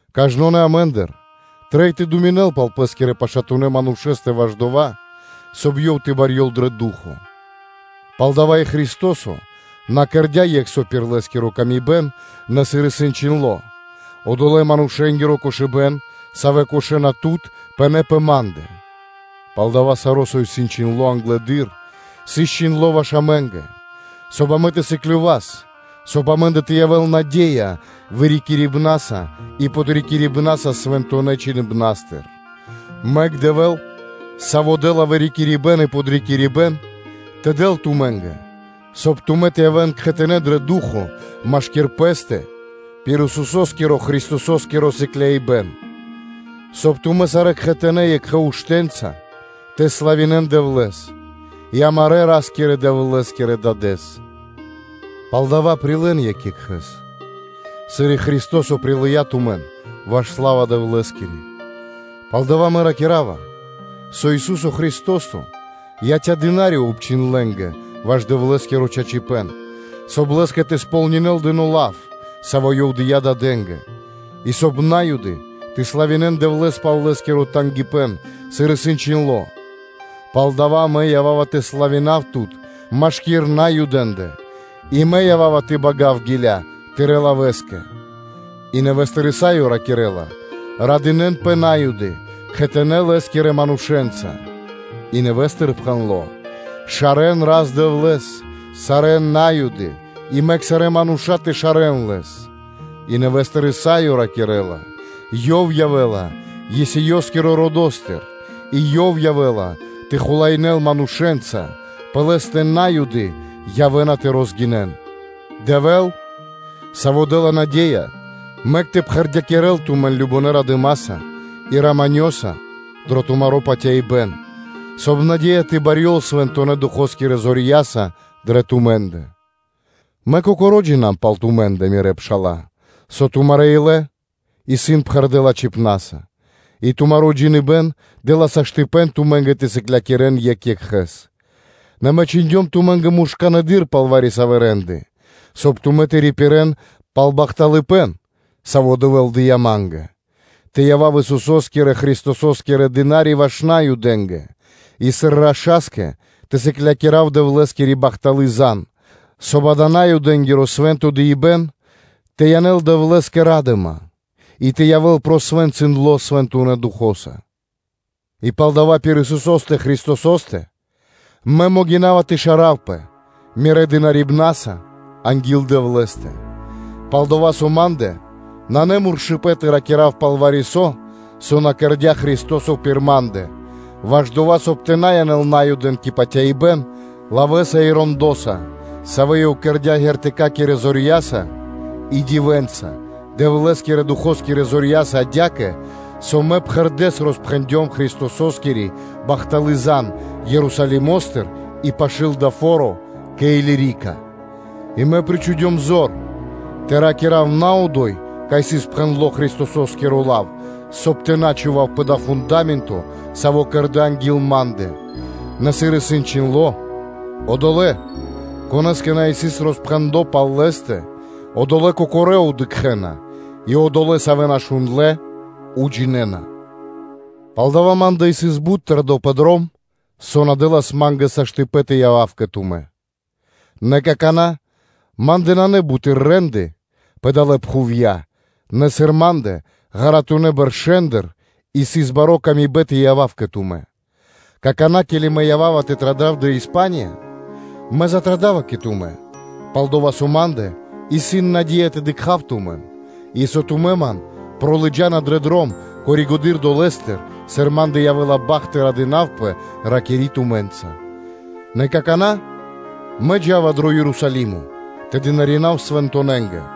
Кажнонэ́ амэ́ндыр трэй тэ думинэл пал пэ́скирэ пашатунэ́ манушэ́стэ ваш дова́, соб (кай) ёв тэ барьёл дрэ ду́хо (фа́но). Палдава́ и Христо́со на кэрдя́ екх со пир Лэ́скиро ило́, нэ, сыр исын чхиндло́: “Одолэ́-манушэ́нгиро кошыбэ́н, савэ́ кошэна Тут, пынэ́ пэ Ма́ндэ.” Палдава́ саро́, со исыс чхиндло́ англэды́р, сыс чхиндло́ ваш амэ́нгэ, соб (кай) амэ тэ сыклёвас, соб (кай) амэ́ндэ тэ явэ́л наде́я вырикирибнаса и подрикирибнаса Свэнтонэ́ Чхиныбна́стыр. Мэк Дэвэ́л, саво́ дэ́ла вырикирибэн и подрикирибэ́н, тэ дэл тумэ́нгэ, соб (кай) тумэ́ тэ явэ́н кхэтанэ́ дро ду́хо (фа́но) машки́р пэ́стэ пир Исусо́скирэ-Христосо́скиро сыкляибэн, соб (кай) тумэ́ сарэ́ кхэтанэ́ екхэ уштэ́нца тэ славинэ́н Дэвлэ́с и амарэ́ Ра́скирэ-Дэвлэ́скирэ Дадэ́с. Палдава́, прилэ́н екх екхэ́с, сыр и Христо́со прилыя́ тумэн, ваш сла́ва Дэвлэ́скири. Палдава́ мэ ракира́ва, со Ису́со Христо́со яця́ дына́ри (слу́га) обчхиндлэнгэ ваш Дэвлэ́скиро чачипэ́н, соб (кай) Лэ́скэ тэ сполнинэл дыно́ лав, саво́ Ёв дыя́ дадэ́нгэ; и соб (кай) На́юды тэ славинэ́н Дэвлэ́с пал Лэ́скиро тангипэ́н, сыр исын чхиндло́: “Пал дава́ мэ ява́ва тэ славинав Тут машки́р Наюдэ́ндэ, и мэ ява́ва тэ бага́в гиля́ Тырэ́ лавэ́скэ!” И нэвэ́стыр Исаё ракирэ́ла: “Радынэ́нпэ На́юды кхэтанэ́ Лэ́скирэ манушэ́нца.” И нэвэ́стыр пхэндло́: “Шарэ́н Рас-Дэвлэ́с, сарэ́ На́юды и мэк сарэ́ мануша́ тэ шарэ́н Лэс.” И нэвэ́стыр Исаё ракирэ́ла: “Ёв явэ́ла Есеёскиро родо́стыр и Ёв явэ́ла тэ хулаинэ́л манушэ́нца: пэ Лэ́стэ На́юды явэ́на тэ розгинэн.” Дэвэ́л, Саво́ дэ́ла наде́я, – мэк тэ пхэрдякирэл тумэн кажнонэ́ радыма́са и раманёса дро тумаро́ патяибэ́н, соб (кай) наде́я тэ барьёл Свэнтонэ́ Духо́скирэ зорья́са дрэ тумэ́ндэ. Мэ кокоро́ джино́м пал тумэ́ндэ, мирэ́ пша́ла, со тумарэ́ илэ исын пхэрдэ́ лачхипна́са, и тумаро́ джиныбэ́н дэ́ла саштыпэн тумэ́нгэ тэ сыклякирэ́н екх екхэ́с. Нэ мэ чхиндём тумэ́нгэ муршканэдыр пал вари-савэ́ рэ́нды, соб (кай) тумэ́ тэ рипирэ́н пал бахталыпэ́н, саво́ Дэвэ́л дыя́ ма́нгэ, тэ явав Исусо́скирэ-Христосо́скиро дына́ри ваш Наюдэ́нгэ и сыр раша́скэ тэ сыклякирав Дэвлэ́скири бахталы́ зан, соб (кай) дава́ Наюдэнгиро свэ́нто дыибэ́н тэ янэл Дэвлэ́скэ ра́дыма и тэ явэ́л посвэнцындло Свэнтонэ́ Духо́са. И палдава́ пир Исусо́стэ Христосо́стэ мэ могина́ва тэ шаравпэ мирэ́ дынарибнаса анги́л Дэвлэ́стэ. Пал-дова́ со ма́ндэ нанэ муршыпэн тэ ракира́в пал вари-со, со на кэрдя́ Христо́со пир ма́ндэ, ваш дова́, соб (кай) тэ янэл Наюдэн кэ патяибэ́н, лавэ́са и рэндоса, савэ́ Ёв кэрдя́, ґэртыкакирэ зорья́са и дивэнца, Дэвлэ́скирэ Духо́скирэ зорья́са адя́кэ, со мэ пхэрдэ́с роспхэндём Христососкири бахталы́ зан (звесь) Ерусалимо́стыр и пашы́л дава́ фо́ро кэ Илирика; и мэ причхудём зор (стариндёмпэ) тэ ракира́в на одо́й, кай сыс пхэндло́ Христосо́скиро лав, соб (кай) тэ на чхував пэ дава́ фунда́менто, саво́ кэрдэ́ анги́л ма́ндэ; нэ сыр исын чхиндло́: “Одолэ́, конэ́скэ на сыс роспхэндло пал Лэ́стэ, одолэ́ кокорэ́ дыкхэ́на, и одолэ́, савэ́ на шундлэ́, уджинэна.” Палдава́ ма́ндэ сыс бут тэрдо́ пэ дром, со на дэ́лас ма́нгэ саштыпэн тэ явав кэ тумэ́. Нэ какана́, ма́ндэ нанэ буты́р рэ́нды пэ далэ́ пхувья́, нэ сыр ма́ндэ ґаратунэ́ бэршэ́ндыр сыс бари ла́ска тэ явав кэ тумэ́, какана́, ке́ли мэ ява́ва тэ традав дрэ Испания, мэ затрадава кэ тумэ́, пал-дова́ со ма́ндэ исын наде́я тэ дыкха́в тумэн, и со тумэ́ ман пролыджана дрэ дром коригэды́р (позжэды́р) долэ́стыр, сыр Мэ чалёвава радыма́са тэ ракира́в тумэ́нца, нэ какана́ мэ джа́ва дро Ерусалимо тэ дынаринав свэнтонэнгэ;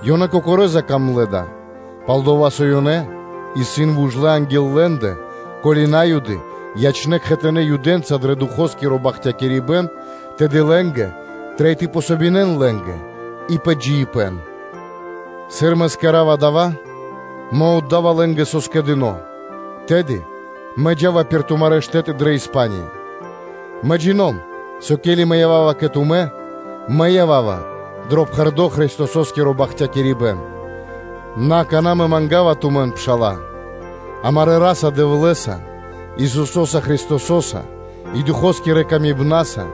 Ёнэ кокорэ́ закамлэ дава́, пал-дова́ со ёнэ исын вужлэ анги́л лэ́ндэ, ко́ли На́юды ячнэ́ кхэтанэ́ Юдэнца дро Духоскиро бахтякирибэ́н, тэды лэ́нгэ трэй тэ помогинэн лэ́нгэ и пэ джиибэ́н. Сыр мэ кэра́ва дава́, мэ отда́ва лэ́нгэ, со скэдыно́, тэды мэ джа́ва пирда́л тумарэ́ штэ́ты дрэ Испания. Мэ джино́м, со ке́ли мэ ява́ва кэ тумэ́, мэ ява́ва дро пхэрдо́ Христосо́скиро бахтякирибэ́н. Нэ, акана́ мэ манга́ва тумэн, пша́ла, амарэ́ Ра́са-Дэвлэ́са, Исусо́са Христосо́са и Духо́скирэ патыва́са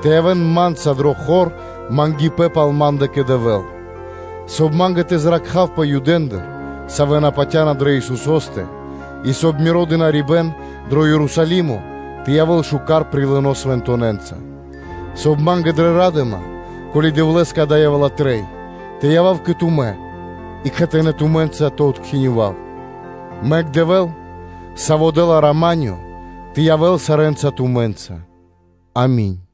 тэ явэ́н ма́нца дро хор мангипэ́н пал ма́ндэ кэ Дэвэ́л; соб (кай) ма́нгэ тэ зракхавпэ Юдэндыр, савэ́ на патя́на дрэ Исусо́стэ и, соб (кай) миро дынарибэ́н дро Ерусалимо тэ явэ́л шука́р прилыно свэнтонэнца; соб (кай) ма́нгэ дрэ ра́дыма, ко́ли Дэвлэ́скэ дава́ явэ́ла трэй, тэ явав кэ тумэ́ и кхэтанэ́ тумэ́нца тэ откинёвав. Мэк Дэвэ́л, Саво́ дэ́ла рама́нё, тэ явэ́л сарэ́нца тумэ́нца. Ами́нь.